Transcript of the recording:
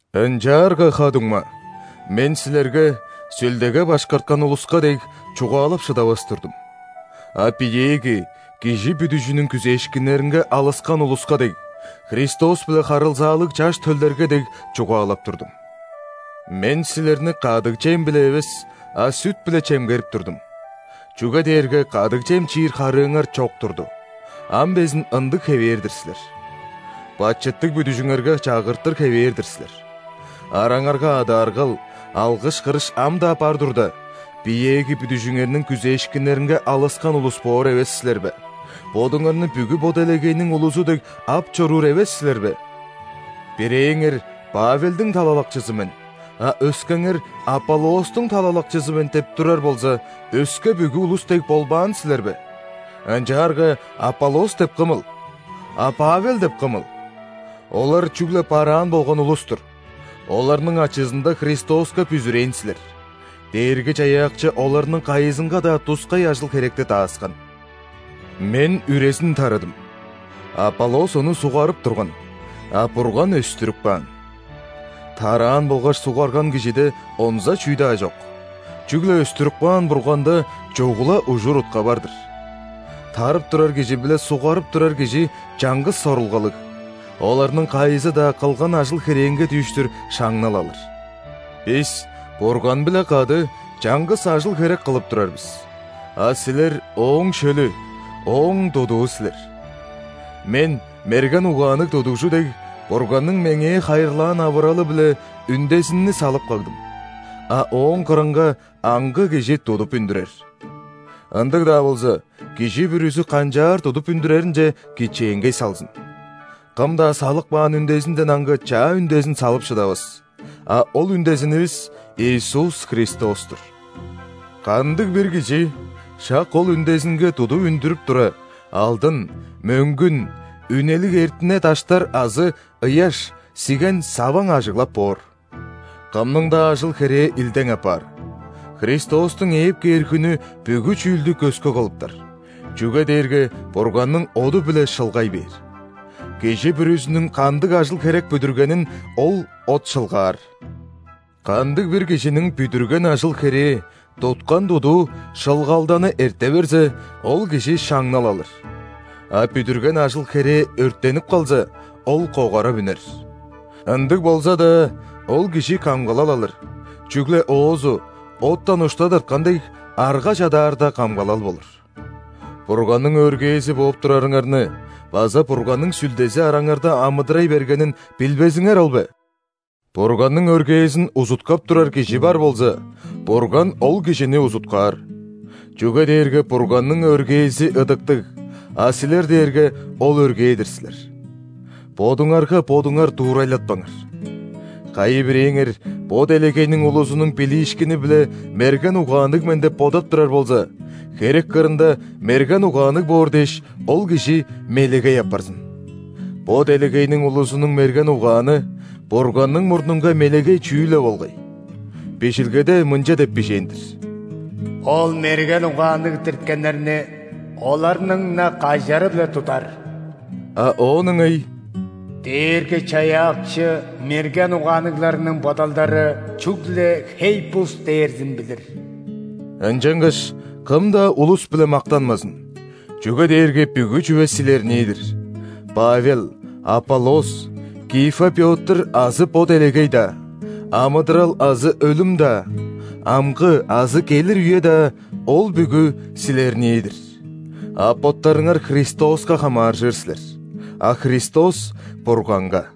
Ынчаарга, ха-дуңма, мен силерге, Сүлдеге башкарткан улуска дег, чугаалап шыдавас турдум, а биеэги кижи бүдүжүнүң күзээшкиннеринге алыскан улуска дег, Христос-биле харылзаалыг чаш төлдерге дег, чугаалап турдум. Мен силерни кадыг чем-биле эвес, а сүт-биле чемгерип турдум, чүге дээрге кадыг чем чиир харыыңар чок турду, ам безин ындыг хевээр-дир силер. Бачыттыг бүдүжүңерге чагыртыр хевээр-дир силер. Араңарга адааргал, алгыш-кырыш ам-даа бар турда, биеэги бүдүжүңерниң күзээшкиннеринге алыскан улус боор эвес силер бе, бодуңарны бүгү бо делегейниң улузу дег ап чоруур эвес силер бе? Бирээңер: «Павелдиң талалакчызы мен», а өскеңер: «Аполлостуң талалакчызы мен» – деп турар болза, өске бүгү улус дег болбаан силер бе? Ынчаарга Аполлос деп кымыл? А Павел деп кымыл? Олар чүгле бараан болган улус-тур. Оларның ачызында Христоска бүзүрээн силер, Дээрги-Чаяакчы оларның кайызынга-даа тускай ажыл-херекти дааскан. Мен үрезин тарыдым, Аполлос ону ·суггарып турган, а Бурган өстүрүп каан. Тараан болгаш суггарган кижиде онза чүү-даа чок, чүгле өстүрүп каан Бурганда чугула ужур-утка бар-дыр. Тарып турар кижи биле суггарып турар кижи чаңгыс сорулгалыг, оларның кайызы-даа кылган ажыл-херээнге дүүштүр шаңнал алыр. Бис Бурган-биле кады чаңгыс ажыл-херек кылып турар бис, а силер – Ооң шөлү, Ооң тудуу силер. Мен, мерген угаанныг тудугжу дег, Бурганның меңээ хайырлаан авыралы-биле үндезинни салып кагдым, а ооң кырынга аңгы кижи тудуп үндүрер. Ындыг-даа болза, кижи бүрүзү канчаар тудуп үндүреринче кичээнгей салзын. Кым-даа салып каан үндезинден аңгы чаа үндезин салып шыдавас, а ол үндезинивис – Иисус Христос-тур. Кандыг-бир кижи шак ол үндезинге тудуп үндүрүп тура, алдын, мөңгүн, үнелиг эртине даштар азы ыяш, сиген, саваң ажыглап боор. Кымның-даа ажыл-херээ илдең апаар, Христостуң ээп кээр хүнү бүгү чүүлдү көскү кылыптар, чүге дээрге Бурганның оду-биле шылгай бээр. Кижи бүрүзүнүң кандыг ажыл-херек бүдүргенин ол от шылгаар. Кандыг-бир кижиниң бүдүрген ажыл-херээ – туткан тудуу шылгалданы эрте берзе, ол кижи шаңнал алыр. А бүдүрген ажыл-херээ өрттенип калза, ол когарап үнер. Ындыг болза-даа, ол кижи камгалал алыр, чүгле оозу, оттан ушта тырткан дег, арга чадаарда камгалал болур. Бурганның өргээзи бооп турарыңарны база Бурганның Сүлдези араңарда амыдырай бергенин билбезиңер ол бе? Бурганның өргээзин узуткап турар кижи бар болза, Бурган ол кижини узуткаар, чүге дээрге Бурганның өргээзи ыдыктыг, а силер дээрге ол өргээ-дир силер. Бодуңарга бодуңар дуурайлатпаңар. Кайы-бирээңер бо делегейниң улузунуң билиишкини-биле мерген угаанныг мен деп бодап турар болза, херек кырында мерген угаанныг боор дээш, ол кижи «мелегей» апарзын. Бо делегейниң улузунуң мерген угааны – Бурганның мурнунга мелегей чүүл-ле болгай. Бижилгеде мынча деп бижээн-дир:«Ол мерген угаанныг дирткеннерниоларның-на кажары-биле тудар». А оон ыңай:«Дээрги-Чаяакчы мерген угаанныгларның бодалдарычүгле хей-бус дээрзин билир». Ынчангаш кым-даа улус-биле мактанмазын, чүге дээрге бүгү чүве силернии-дир: Павел, Аполлос, Кифа Пётр азы бо делегей-даа, амыдырал азы өлүм-даа, амгы азы келир үе-даа – ол бүгү силернии-дир, а боттарыңар Христоска хамааржыр силер, а Христос – Бурганга.